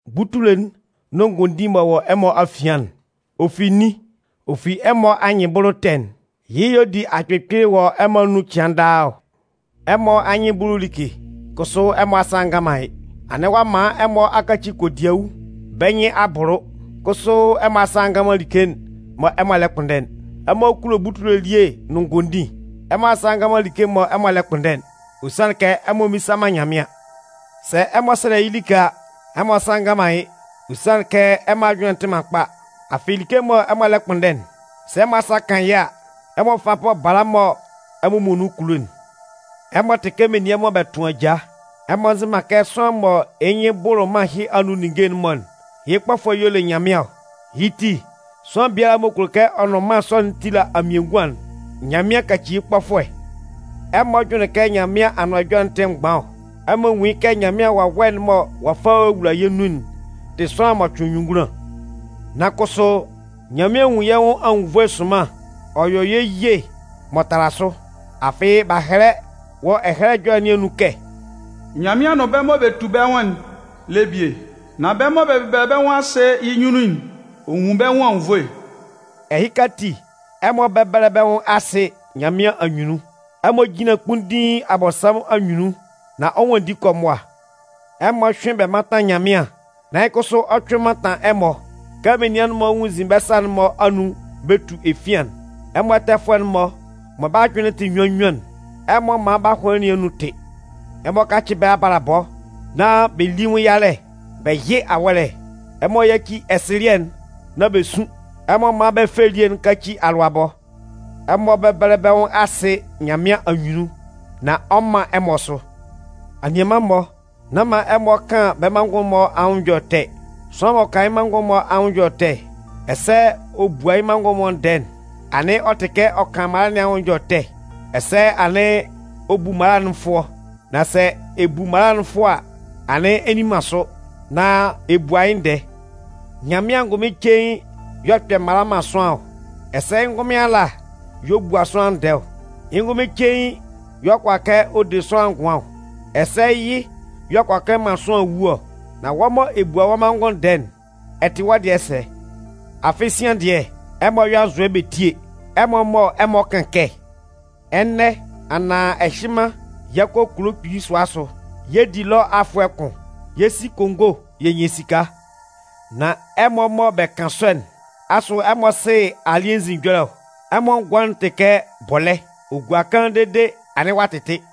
Butule'n nʋn ngondin m'ɔ wɔ ɛmɔ afian'n, ɔ fi nin? Ɔ fi ɛmɔ anyɩnbʋlʋ ɛtɛ'n. Yɩ́ y'ɔ di akpɩlɩkpɩlɩ wɔ ɛmɔ anun cɩan daa ɔ. Ɛmɔ anyɩn bʋlʋ like, kʋsʋ ɛmɔ asa ngan man yɩ́. Anɩn ɔ'a man ɛmɔ a kaci kodiawu, bɛ́ nyɩn a bʋlʋ, kʋsʋ ɛmɔ asa ngan man like'n mɔ ɛmɔ lɛ kpʋnndɛ'n. Ɛmɔ kulo butule elie nʋn ngondin. Ɛmɔ asa ngan man like mɔ ɛmɔ lɛ kpʋnndɛ'n, ɔ sanlɩn kɛ ɛmɔ mmisa man Nyanmɩan. Sɛ ɛmɔ sɛlɛ yɩ́ like a, ɛmɔ asa ngan man yɩ́, ɔ sanlɩn kɛ ɛmɔ ajʋnlɩn'n tɩ man kpa. Afɩ, like'n mɔ ɛmɔ lɛ kpʋnndɛ'n, sɛ ɛmɔ asa kan yɩ́ a, ɛmɔ fa bɔ bala mɔ ɛmɔ muonun kulo'n. Ɛmɔ tɩ kɛ menian mɔ bɛ tʋn ajaa. Ɛmɔ nzɩ man kɛ sʋanlan m'ɔ yɩ́ nyɩn bʋlʋ mân ɛhɩ anun ninnge'n-mɔ'n, yɩ́ kpɔfʋɛ y'ɔ le Nyanmɩan ɔ? Yɩ́ ti, sʋanlan biala m'ɔ kulo kɛ ɔ nʋn mân sɔ'n tila amienguan'n, Nyanmɩan kaci yɩ́ kpɔfʋɛ. Ɛmɔ jʋnlɩn kɛ Nyanmɩan Anʋan Ɛjɔlɛ tɩ mgban ɔ? Ɛmɔ nwún yɩ́ kɛ Nyanmɩan Wawɛ'n mɔ ɔ'a fa ɔ'a wula yɛ́ nun'n tɩ sʋanlan m'ɔ cʋɩn nyunngunlan! Nan kʋsʋ, Nyanmɩan nwun yɛ́ nwʋn anwunnvoe sʋnman ɔ yɔ yɛ́ ye m'ɔ tala sʋ. Afɩ, b'a hɛlɛ wɔ Ɛhɛlɛ Ɛjɔlɛ nɩn anun kɛ: “Nyanmɩan nʋn bɛ́ mɔ bɛ tu bɛ́ nwʋn'n le bie. Nan bɛ́ mɔ bɛ bɛbɛlɛ bɛ́ nwʋn asɩ yɩ́ nyunnun'n, ɔ nwun bɛ́ nwʋn anwunnvoe.” Ɛhɩka ati, ɛmɔ bɛ́bɛlɛ bɛ́ nwʋn asɩ Nyanmɩan anyunnun. Ɛmɔ jínlan kpunndiin Abɔnsanmʋn anyunnun nán ɔ 'nwanndi kɔ mʋa. Ɛmɔ hyʋ́ɩn bɛ mántan Nyanmɩan, nán yɩ́ kʋsʋ ɔ 'cʋɩn mantan ɛmɔ. Kɛ menian'n-mɔ nwunnzin bɛ́ sa'n-mɔ anun bɛ tu efian'n, ɛmɔ ɛtɛfʋɛ'n-mɔ mɔ bɛ́ ajʋnlɩn'n tɩ nnyuan nnyuan'n, ɛmɔ mán bɛ́ ahʋnlɩn nɩn anun tɩ́. Ɛmɔ kácɩ bɛ́ abalabɔ nán bɛ lí yɩ́ nwʋn yalɛ, bɛ yɩ́ awɔ́lɛ. Ɛmɔ yáci ɛsɩlɩɛ'n nán bɛ sún. Ɛmɔ mán bɛ fɛ elie'n káci alʋabɔ. Ɛmɔ bɛ́bɛlɛ bɛ́ nwʋn asɩ Nyanmɩan anyunnun nán ɔ 'man ɛmɔ sʋ. Anianman-mɔ, nán man ɛmɔ kan bɛ́ manngʋn'n-mɔ anwʋn ɛjɔlɛ ɛtɛ. Sʋanlan m'ɔ kan yɩ́ manngʋn'n-mɔ anwʋn ɛjɔlɛ ɛtɛ, ɛsɛ ɔ bua yɩ́ manngʋn'n-mɔ ndɛɛ'n, anɩn ɔ tɩ kɛ ɔ kan mala nɩn anwʋn ɛjɔlɛ ɛtɛ, ɛsɛ anɩn ɔ bu mala'n fʋɔ. Nan sɛ ɛ bu mala'n fʋɔ a, anɩn ɛ nni man sʋ, nan ɛ bua yɩ́ ndɛɛ. Nyanmɩan angʋnmɩn cein y'ɔ kpɛ mala man sʋanlan ɔ, ɛsɛ yɩ́ ngʋnmɩn ala y'ɔ bua sʋanlan ndɛɛ ɔ. Yɩ́ ngʋnmɩn cein y'ɔ kʋala kɛ ɔ de sʋanlan ngʋan ɔ, ɛsɛ yɩ́ y'ɔ kʋala kɛ ɔ man sʋanlan wu ɔ. Nan wɔ́ mɔ ɛ bua wɔ́ manngʋn ndɛɛ'n, ɛ tɩ wɔ́ dɩɛ sɛ? Afɩ sian dɩɛ, ɛmɔ yɔ́ anzʋɛ bɛ tíe! Ɛmɔ mɔ ɛmɔ kan kɛ: “Ɛnɛ anaan ɛhɩnman yɛ 'kɔ kulo kpili sʋa asʋ. Yɛ 'di ɛlɔ afʋɛ kʋn. Yɛ 'si kongo yɛ nyan esika.” Nan ɛmɔ mɔ bɛ kan sɔ'n, asʋ ɛmɔ sɩ alɩ́ɛ nzin ɛjɔlɛ ɔ? Ɛmɔ ngʋan'n tɩ kɛ bɔlɛ́. Ɔ gua kaan dede, anɩn ɔ'a tɩtɩ.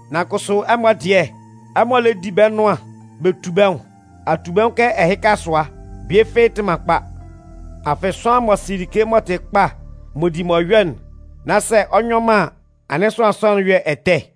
Nan kʋsʋ ɛmɔ dɩɛ, ɛmɔ lɛ di bɛ́ nʋan, bɛ tu bɛ́ nwʋn. Atubɛnwʋn kɛ ɛhɩka sʋa bie fɩ́ɩ́ tɩ man kpa. Afɩ, sʋanlan m'ɔ sɩ like m'ɔ tɩ kpa m'ɔ di m'ɔ yɔ'n, nán sɛ ɔ nyɔ man an, anɩn sʋanlan sɔ'n yɔ ɛtɛ.